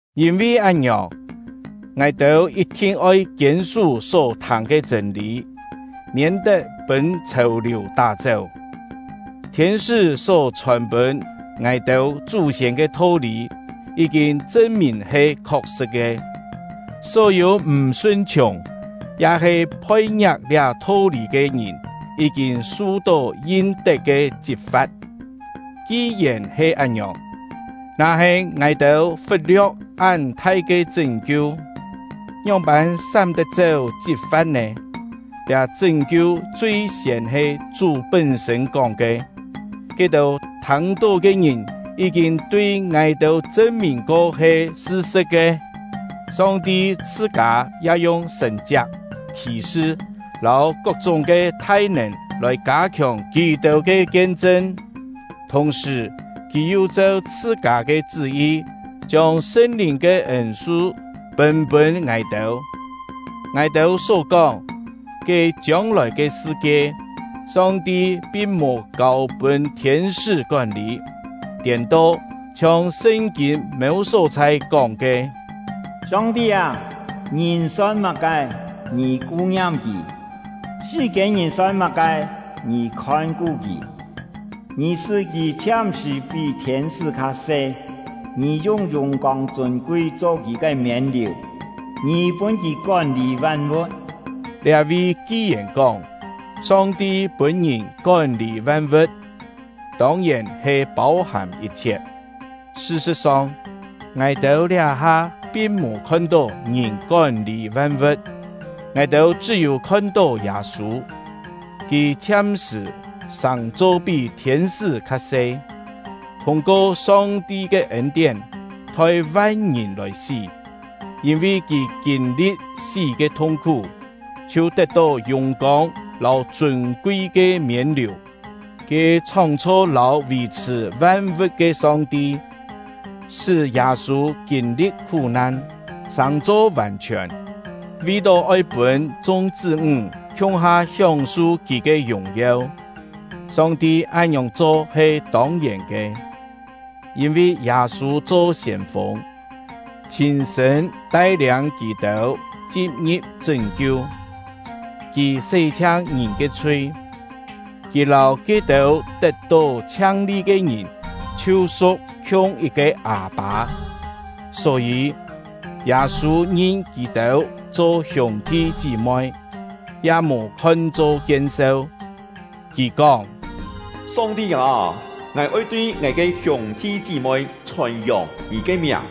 Yîn-vi án-ngiòng, ngài-têu yit-thin oi kiên-sú só thâng ke chṳ̂n-lî, miên-tet pûn chhèu-liù tá-chéu. Thiên-sṳ́ só chhòn-pûn ngài-têu chú-siên ke tho-lî yí-kîn chṳn-mìn he khok-sṳ̍t ke; só-yû m̀ sun-chhiùng ya-he phoi-ngia̍k liá tho-lî ke ngìn yí-kîn su-tó yin-tet ke chit-fa̍t. Ki-yèn he án-ngiòng, na-he ngài-têu fut-lio̍k án thai ke chṳ́n-kiu, ngióng-pân sám-tet-chéu chit-fa̍t nè? Liá chṳ́n-kiu chui-siên he Chú pún-sṳ̂n kóng ke; ke-têu thâng-tó ke ngìn yí-kîn tui ngài-têu chṳn-mìn ko he sṳ-sṳ̍t ke. Song-ti chhṳ-kâ ya yung sṳ̀n-chiak, khì-sṳ, lâu kok-chúng ke thai-nèn lòi kâ-khiòng kì-têu ke kien-chṳn; thùng-sṳ̀, Kì yu cheu chhṳ-kâ ke chṳ́-yi, chiông Sṳn-Lìn ke ên-su pûn-pûn ngài-têu. Ngài-têu só kóng, ke chiông-lòi ke sṳ-kie, Song-ti pin mò kâu-pûn thiên-sṳ́ kón-lî. Tiên-to, chhiong Sṳn-kîn mêu só-chhai kóng ke: Song-ti â, ngìn son má-ke, Ngì ku-ngiam kì! Sṳ-kiên-ngìn son má-ke, Ngì khon-ku kì! Ngì sṳ́ kì chhiam-sṳ̀ pí thiên-sṳ́ kha se; Ngì yung yùng-kông chûn-kui cho kì ke miên-liù; Ngì pûn kì kón-lî van-vu̍t. Liá-vi ki-yèn kóng, Song-ti pûn ngìn “kón-lî van-vu̍t”, tông-yèn he pâu-hàm yit-chhiet; sṳ-sṳ̍t-song, ngài-têu liá-ha pin mò khon-tó ngìn kón-lî van-vu̍t. Ngài-têu chṳ́-yû khon-tó Yâ-sû, kì chhiam-sṳ̀ sàng-cho pí thiên-sṳ́ kha se, thûng-ko Song-ti ke ên-tién, thoi van-ngìn lòi sí; yîn-vi kì kîn-li̍t sí ke thung-khú, chhiu tet-tó yùng-kông lâu chûn-kui ke miên-liù. Ke chhóng-chho lâu vì-chhṳ̀ van-vu̍t ke Song-ti, sṳ́ Yâ-sû kîn-li̍t khú-nan, sàng-cho vàn-chhiòn, vi-tó oi pûn chung chṳ́-ńg khiung-ha hióng-su kì ke yùng-yeu; Song-ti án-ngiòng cho he tông-yèn ke. Yîn-vi Yâ-sû cho siên-fûng, chhîn-sṳ̂n tai-liâng kì-têu chin-ngi̍p chṳ́n-kiu. Kì sé-chhiang ngìn ke chhui; kì lâu ke-têu tet-tó chhiang-li ke ngìn chhiu su̍k khiung yit-ke Â-pâ. Só-yî, Yâ-sû ngin kì-têu cho hiûng-thi chí-moi, ya mò khon-cho kien-seu. Kì kóng: Song-ti â, ngài oi tui ngài ke hiûng-thi chí-moi chhòn-yòng Ngì ke miàng;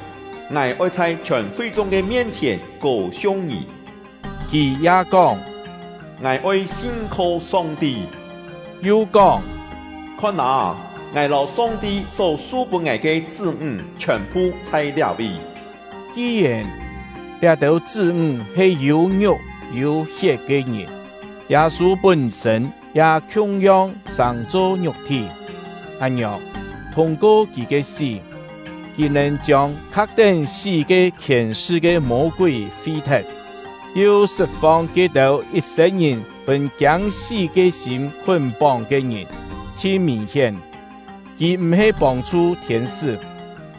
ngài oi chhai chhiòn fi-chung ke mien-chhièn kô-siung Ngì. Kì ya kóng: Ngài oi sin-kho Song-ti; yu kóng: Khon â, ngài lâu Song-ti só su-pûn ngài ke chṳ́-ńg chhiòn-phu chhai liá-vi. Ki-yèn liá-têu chṳ́-ńg he yû ngiuk yû hiet ke ngìn, Yâ-sû pún-sṳ̂n ya khiung-yong sàng-cho ngiuk-thí; án-ngiòng, thûng-ko kì ke sí, kì nèn chiông kha̍k-tén sí ke khièn-sṳ ke Mô-kúi fi-thet, yu sṳt-fong ke-têu yit-sên-ngìn pûn kiâng-sí ke sîm khún-póng ke ngìn. Chhin mìn-hién, kì m̀-he pông-chhu thiên-sṳ́;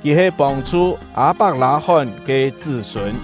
kì he pông-chhu Â-pak-lâ-hón ke chṳ́-sûn.